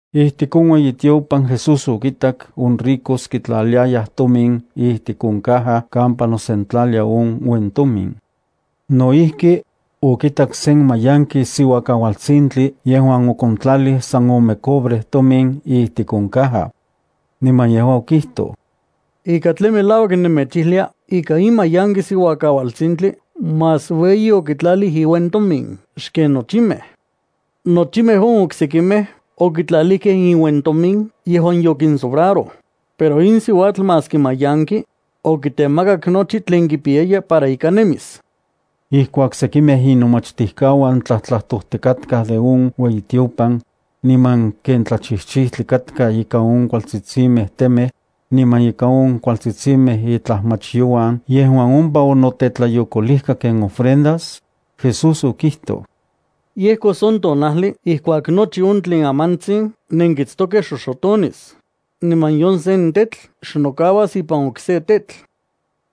Ijtik on ueyitiopan Jesús okintak on ricos kitlaliayaj tomin ijtik on caja kampa nosentlalia on uentomin. No ijki okitak sen mayanki siuakaualtsintli yejuan okontlalij san ome cobre tomin ijtik on caja. Niman yejua okijtoj: —Ika tlen melauak nemechijlia ika in mayanki siuakaualtsintli más ueyi okitlalij iuentomin xken nochimej. Nochimej on oksekimej okitlalijkej inuentomin yejuan yokinsobraroj, pero in siuatl, maski mayanki, okitemakak nochi tlen kipiyaya para ika nemis. Ijkuak sekimej inomachtijkauan tlajtlajtojtikatkaj de on ueyitiopan niman ken tlachijchijtli katka ikan on kualtetsitsimej temej niman ika on kualtsitsimej itlajmachyouan yejuan ompa onotetlayokolijka ken ofrendas, Jesús okijtoj: —Yejkos on tonajli ijkuak nochi on tlen amantsin nenkitstokej xoxotonis, niman nion sen tetl xnokauas ipan okse tetl.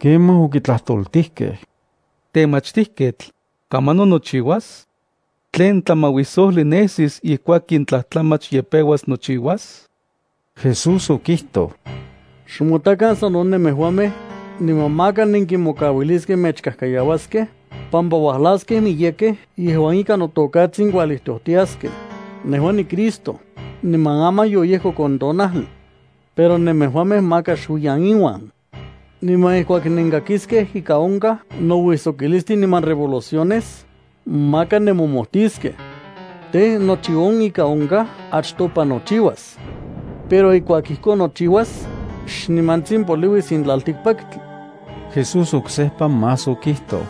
Kemaj okitlajtoltijkej: —Temachtijketl, ¿kamanon nochiuas? ¿Tlen tlamauisojli nesis ijkuak in tlajtlamach ye peuas nochiuas? Jesús okijtoj: —Xmotakan sano nemejuamej, niman maka nenkimokauiliskej mechkajkayauaskej, pampa uajlaskej miyekej yejuan ikan noTokatsin kualijtojtiaskej: “Nejua niCristo”, niman “Aman yoyejkok on tonajli.” Pero nemejuamej maka xuiyan inuan. Niman ijkuak nenkakiskej ika onkaj nouijsokilistin niman revoluciones, maka nemomojtiskej. Tej, nochi on ika onkaj achtopa nochiuas. Pero ijkuak ijkon nochiuas, xnimantsin poliuis in tlaltikpaktli. Jesús oksejpa más okijtoj: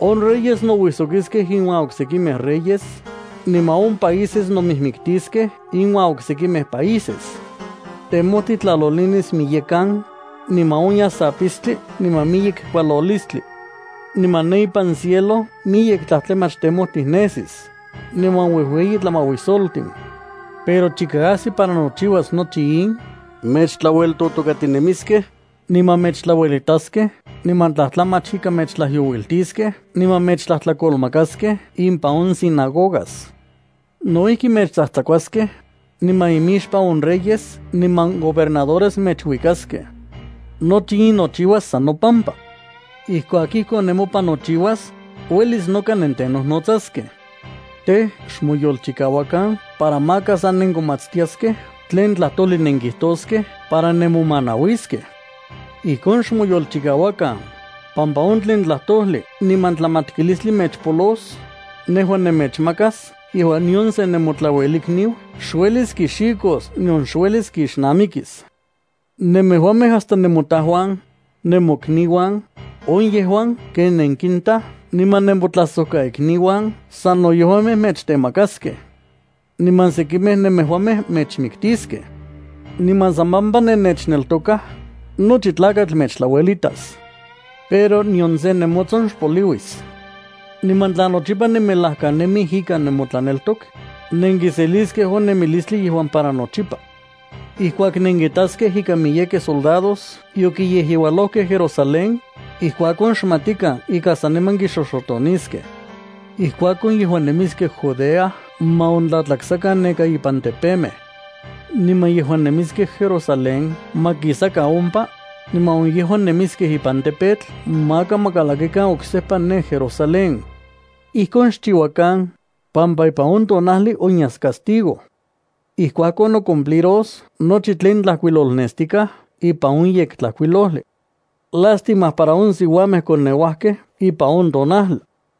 —On reyes nouijsokiskej iuan oksekimej reyes, niman on países nomijmiktiskej iuan oksekimej países. Temojtij tlalolinis miyekan, niman onyas apistli niman miyek kualolistli miyekan. Niman ne ipan cielo miyek tlajtlamach temojtij nesis, niman uejueyi tlamauisoltin. ’Pero chika ajsi para nochiuas nochi in, mechtlaueltotokatinemiskej, niman mechtlauelitaskej niman tlajtlamach ika mechtlajyouiltiskej niman mechtlajtlakolmakaskej impan on sinagogas. No ijki mechtsajtsakuaskej, niman imixpan on reyes niman gobernadores mechuikaskej. Nochi in nochiuas san nopampa. Ijkuak ijkon nemopan nochiuas, uelis noka nentenojnotsaskej. Tej, xmoyolchikauakan para maka sa nenkomatstiaskej tlen tlajtojli nenkijtoskej para nemomanauiskej. Ijkon xmoyolchikauakan, pampa on tlen tlajtojli niman tlamatkilistli mechpolos, nejua nemechmakas yejuan nion se nemotlauelikniu xuelis kixikos nion xuelis kixnamikis. Nemejuamej hasta nemotajuan, nemokniuan, on yejuan ken nenkinta niman nemotlajsojkaikniuan sano yejuamej mechtemakaskej. Niman sekimej nemejuamej mechmiktiskej. Niman san pampa nennechneltokaj, nochi tlakatl mechtlauelitas. Pero nion se nemotson xpoliuis. Niman tla nochipa nemelajkanemij ikan nemotlaneltok, nenkiseliskej on nemilistli yejuan para nochipa. ’Ijkuak nenkitaskej ika miyekej soldados yokiyejyeualojkej Jerusalén, ijkuakon xmatikan ika saniman kixoxotoniskej. Ijkuakon, yejuan nemiskej Judea ma ontlatlaksakan neka ipan tepemej. Niman yejuan nemiskej Jerusalén ma kisakan ompa, niman on yejuan nemiskej ipan campo maka ma kalakikan oksejpa ne Jerusalén. Ijkon xchiuakan, pampa ipan on tonajli onyas castigo. Ijkuakon, nocumpliros nochi tlen tlajkuilolnestikaj ipan on Yektlajkuilojli. Lástima para on siuamej koneuajkej ipan on tonajli,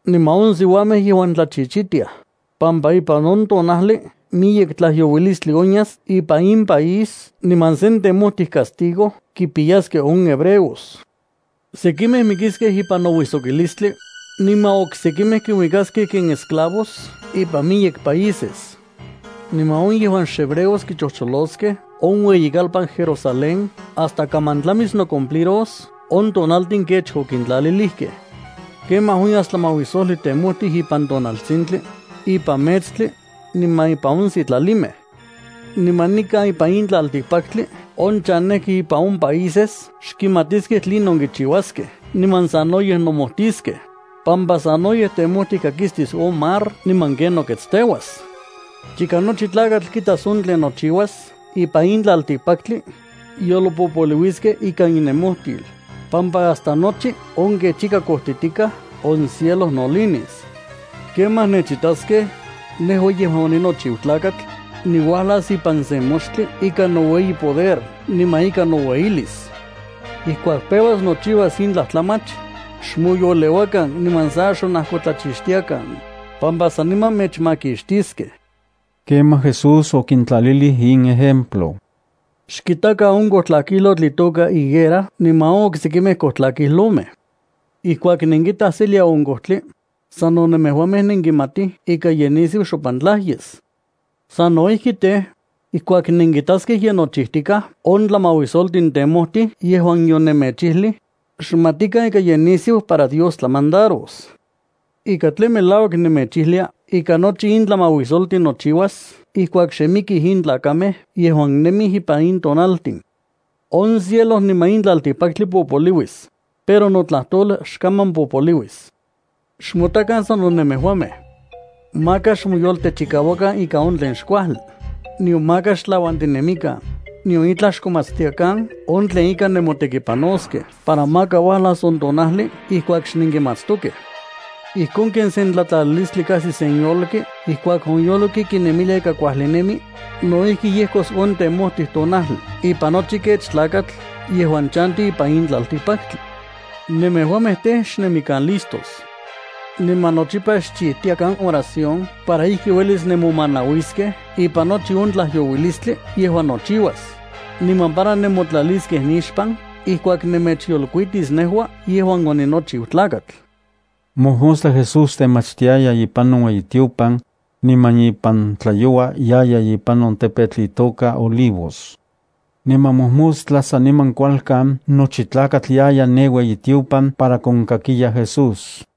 niman on siuamej yejuan tlachichitiaj, pampa ipan on tonajli miyek tlajyouilistli onyas ipan in país niman sen temojtij castigo kipiyaskej on hebreos. Sekimej mikiskej ipan nouijsokilistli, niman oksekimej kinuikaskej ken eslavos ipan miyek países. Niman on yejuan xhebreos kichojcholoskej on ueyikalpan Jerusalén hasta kaman tlamis nocumpliros on tonaltin kech okintlalilijkej. ’Kemaj onyas tlamauisojli temojti ipan tonaltsintli, ipan metstli, niman impan on sitlalimej. Niman nikan ipan in tlaltikpaktli on chanejkej ipan on países xkimatiskej tlinon kichiuaskej niman sanoyej nomojtiskej, pampa sanoyej temojtij kakistis on mar niman ken noketsteuas. Chika nochi tlakatl kitaskej on tlen nochiuas ipan in tlaltikpaktli, yolpopoliuiskej ikan innemojtil, pampa hasta nochi on kech ika kojtitikaj on cielo nolinis. Kemaj nechitaskej, nejua yejuan oninochiu Tlakatl, niuajlas ipan sen moxtli ikan noueyi poder niman ikan noueyilis. Ijkuak peuas nochiuas in tlajtlamach, xmoyoleuakan niman sa xonajkotlachixtiakan, pampa saniman mechmakixtiskej. Kemaj Jesús okintlalilij in ejemplo: —Xkitakan on kojtlakijlotl itoka higuera niman on oksekimej kojtlakijlomej. Ijkuak nenkitaj selia on kojtli, sano nemejuamej nenkimatij ika ye nisiu xompantlaj yes. Sano ijki, tej, ijkuak nenkitaskej ye nochijtikaj on tlamauisoltin temojtli yejuan yonemechijlij, xmatikan ika ye nisiu para Dios tlamandaros. ’Ika tlen melauak nemechijlia ika nochi in tlamauisoltin nochiuas ijkuak xe mikij in tlakamej yejuan nemij ipan in tonaltin. On cielo niman in tlaltikpaktli popoliuis, pero notlajtol xkaman popoliuis. ’Xmotakan sano nemejuamej. Maka xmoyoltechikauakan ika on tlen xkuajli, nion maka xtlauantinemikan, nion itlaj xkomatstiakan on tlen ika nemotekipanoskej para maka uajlas on tonajli ijkuak xnenkimatstokej. Ijkon ken sen tlatlalilistli kajsi sen yolki ijkuak on yolki kinemilia ika kuajli nemi, no ijki yejkos on temojtij tonajli ipan nochi kech tlakatl yejuan chanti ipan in tlaltikpaktli. Nemejuamej tej, xnemikan listos. Niman nochipa xchijtiakan oración para ijki uelis nemomanauiskej ipan nochi on tlajyouilistli yejuan nochiuas, niman para nenmotlaliskej nixpan ijkuak nemechyolkuitis nejua yejuan oninochiu Tlakatl. Mojmostla Jesús temachtiaya ipan on ueyitiopan, niman ipan tlayoua yaya ipan on tepetl itoka Olivos. Niman mojmostla saniman kualkan nochi tlakatl yaya ne ueyitiopan para konkakiya Jesús.